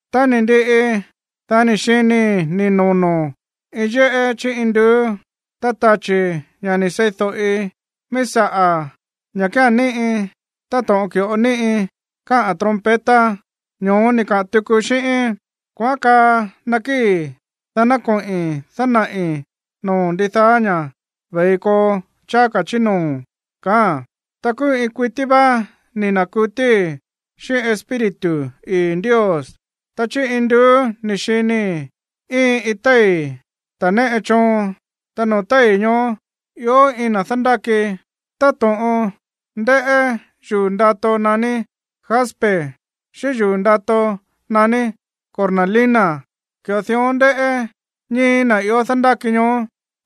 Tá ni̱ ndiꞌi, dá ni̱ xinii̱ ni̱ nono̱ iin yéꞌé chí induú, ta tachi̱, ña̱ ni̱ sei̱do̱ꞌi míí saꞌa̱, ña̱ kía̱n níꞌi táto̱ꞌon ki̱ꞌo ni̱ꞌi káꞌa̱n trompeta, ño̱ó ni̱ kaa tuku xíꞌíín: ―Kuaꞌán kaa, nakíi̱, dá ná koꞌi̱n dánaꞌi̱ noo̱o̱n ndidaá ña̱ ve̱i koo cháá ka̱ chí noo̱ ―kaáa̱n. Ta kúú iin kuití vá ni̱ na̱kutíí xíꞌín Espíritu ii̱ Ndios. Ta chí induú ni̱ xinii̱ íin iin téi̱ ta̱ néꞌe choon, ta noo̱ téi̱ ñoó ió iin na̱ dándáki. Táto̱ꞌon ndéꞌé yuu̱ ndato naní jaspe xíꞌín yuu̱ ndato naní cornalina, ki̱ꞌo dión ndéꞌé ñíi̱ na̱ ió dándáki ñoó.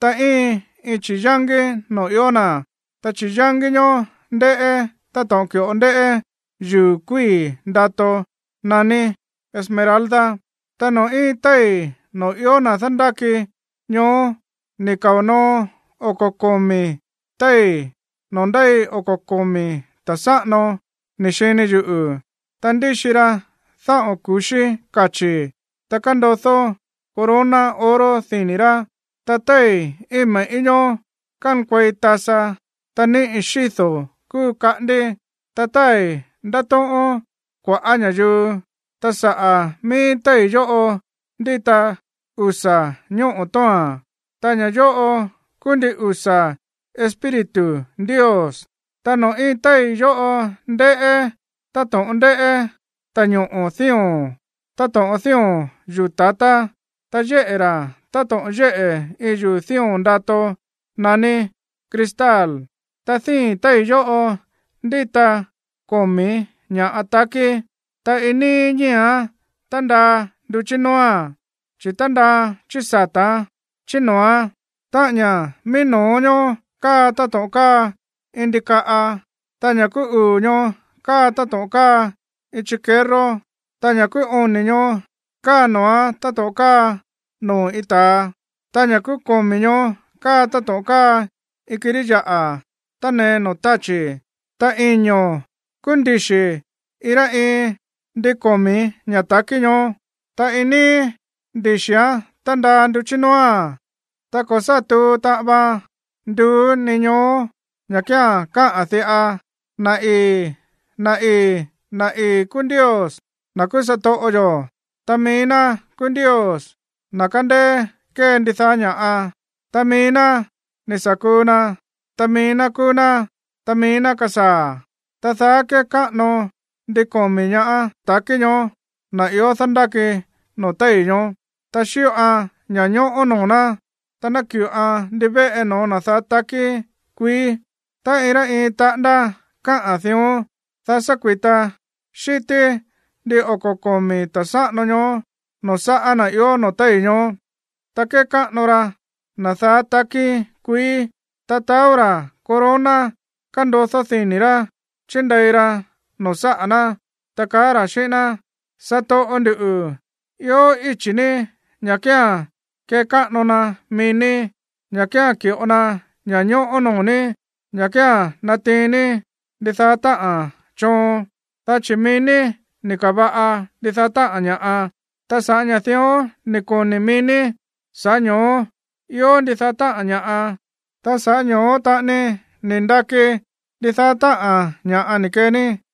Ta íin iin chi̱yángí noo̱ ió na̱, ta chi̱yángí ñoó ndéꞌé táto̱ꞌon ki̱ꞌo ndéꞌé yuu̱ kuíi̱ ndato naní esmeralda. Ta noo̱ íin téi̱ noo̱ ió na̱ dándáki ñoó ni̱ kao̱ noo oko̱ komi̱ téi̱ noo̱ ndéi oko̱ komi̱ ta̱ sáꞌano, ni̱ xini yuꞌu̱, ta ndíxi ra dáꞌo̱n ku̱xí kachi̱, ta kándodó corona oro dini̱ rá. Ta téi̱ íin me̱ꞌí ñoó kánkuei tasa, ta níꞌi xído̱ kúu kaꞌándí, ta tái̱ ndátóꞌón kua̱ꞌá ña̱yuu. Ta saꞌa̱ mií téi̱ yóꞌo ndíta usa̱ ñóꞌo̱ tóo̱a̱n, ta ña̱ yóꞌo kúú ndin usa̱ espíritu Ndios. Ta noo̱ íin téi̱ yóꞌo ndéꞌé táto̱ꞌon ndéꞌé ta̱ñoꞌo̱ dío̱n táto̱ꞌon dío̱n yuu̱ ta̱tá, ta yéꞌe̱ ra̱ táto̱ꞌon yéꞌe̱ iin yuu̱ dío̱n ndato naní cristal. Ta díi̱n téi̱ yóꞌo ndíta komi̱ ña̱ꞌa takí, ta iin níí ñíi̱án tándaa nduchí nóóa̱n, chi̱ tándaaa̱n chí sata̱án, chí noo̱án. Táꞌa̱n ña̱ mií no̱ó ñoó káa táto̱ꞌon káa iin ndikaꞌa, ta ña̱ kúú uu̱ ñoó káa táto̱ꞌon káa iin chikerró, ta ña̱ kúú oni̱ ñoó káa noo̱án táto̱ꞌon káa noo̱ iin ta̱a, ta ña̱ kúú komi̱ ñoó káa táto̱ꞌon káa iin kirí yaꞌa̱ tánee noo̱ táchi̱. Ta iño̱ kúú ndixi̱ iin rá iin ndin komi̱ ña̱ ta̱kí ñoó, ta iin níí ndixi̱án tándaa nduchí nóóa̱n. Ta ko̱ sá tuu taꞌan vaan nduú ni ñoó ña̱ kía̱n káꞌa̱n diꞌa: Na̱ ii̱, na̱ ii̱, na̱ ii̱ kúú Ndios, na̱ kúú satoꞌo yo̱, ta mií ná kúú Ndios, na̱ kándéé kée ndidaá ña̱ꞌa. Ta mií ná ni̱ sa̱ kuu na, ta mií ná kúú ná, ta mií ná kúú na̱ kasaa̱. Ta daá kékáꞌano ndin komi̱ ña̱ ta̱kí ñoó na̱ ió dándáki noo̱ téi̱ ñoó, ta xíꞌoan ña̱ñóꞌó noo̱ ná, ta náki̱ꞌoan ndivéꞌe noo̱ na̱ daá takí kuií. Ta iin rá iin taꞌándá káꞌa̱n dión, dá sa̱ kui̱ta xi̱tí ndin oko̱ komi̱ ta̱ sáꞌano ñoó noo̱ sáꞌa̱ na̱ ió noo̱ téi̱ ñoó, ta kékáꞌano ra na̱ daá takí kuií, ta taó ra̱ corona kándodó dini̱ rá chindei ra noo̱ sáꞌa̱ ná, ta kaá ra̱ xíꞌín ná: Satoꞌo ndu̱, ió íchi̱ ní ña̱ kía̱n kekáꞌano na mií ní, ña̱ kía̱n ki̱ꞌo na ña̱ñóꞌó noo̱ ní, ña̱ kía̱n natiin ní ndidaá táꞌa̱n choon, dá chi̱ mií ní ni̱ ka̱va̱ꞌa ndidaá táꞌa̱n ña̱ꞌa. Ta sa̱ꞌá ña̱ dión ni̱ koni̱ mií ní, sa̱ꞌá ño̱ó ió ndidaá táꞌa̱n ña̱ꞌa, ta sa̱ꞌá ño̱ó taꞌani ni̱ ndaki ndidaá táꞌa̱n ña̱ꞌa ni̱ kee ní.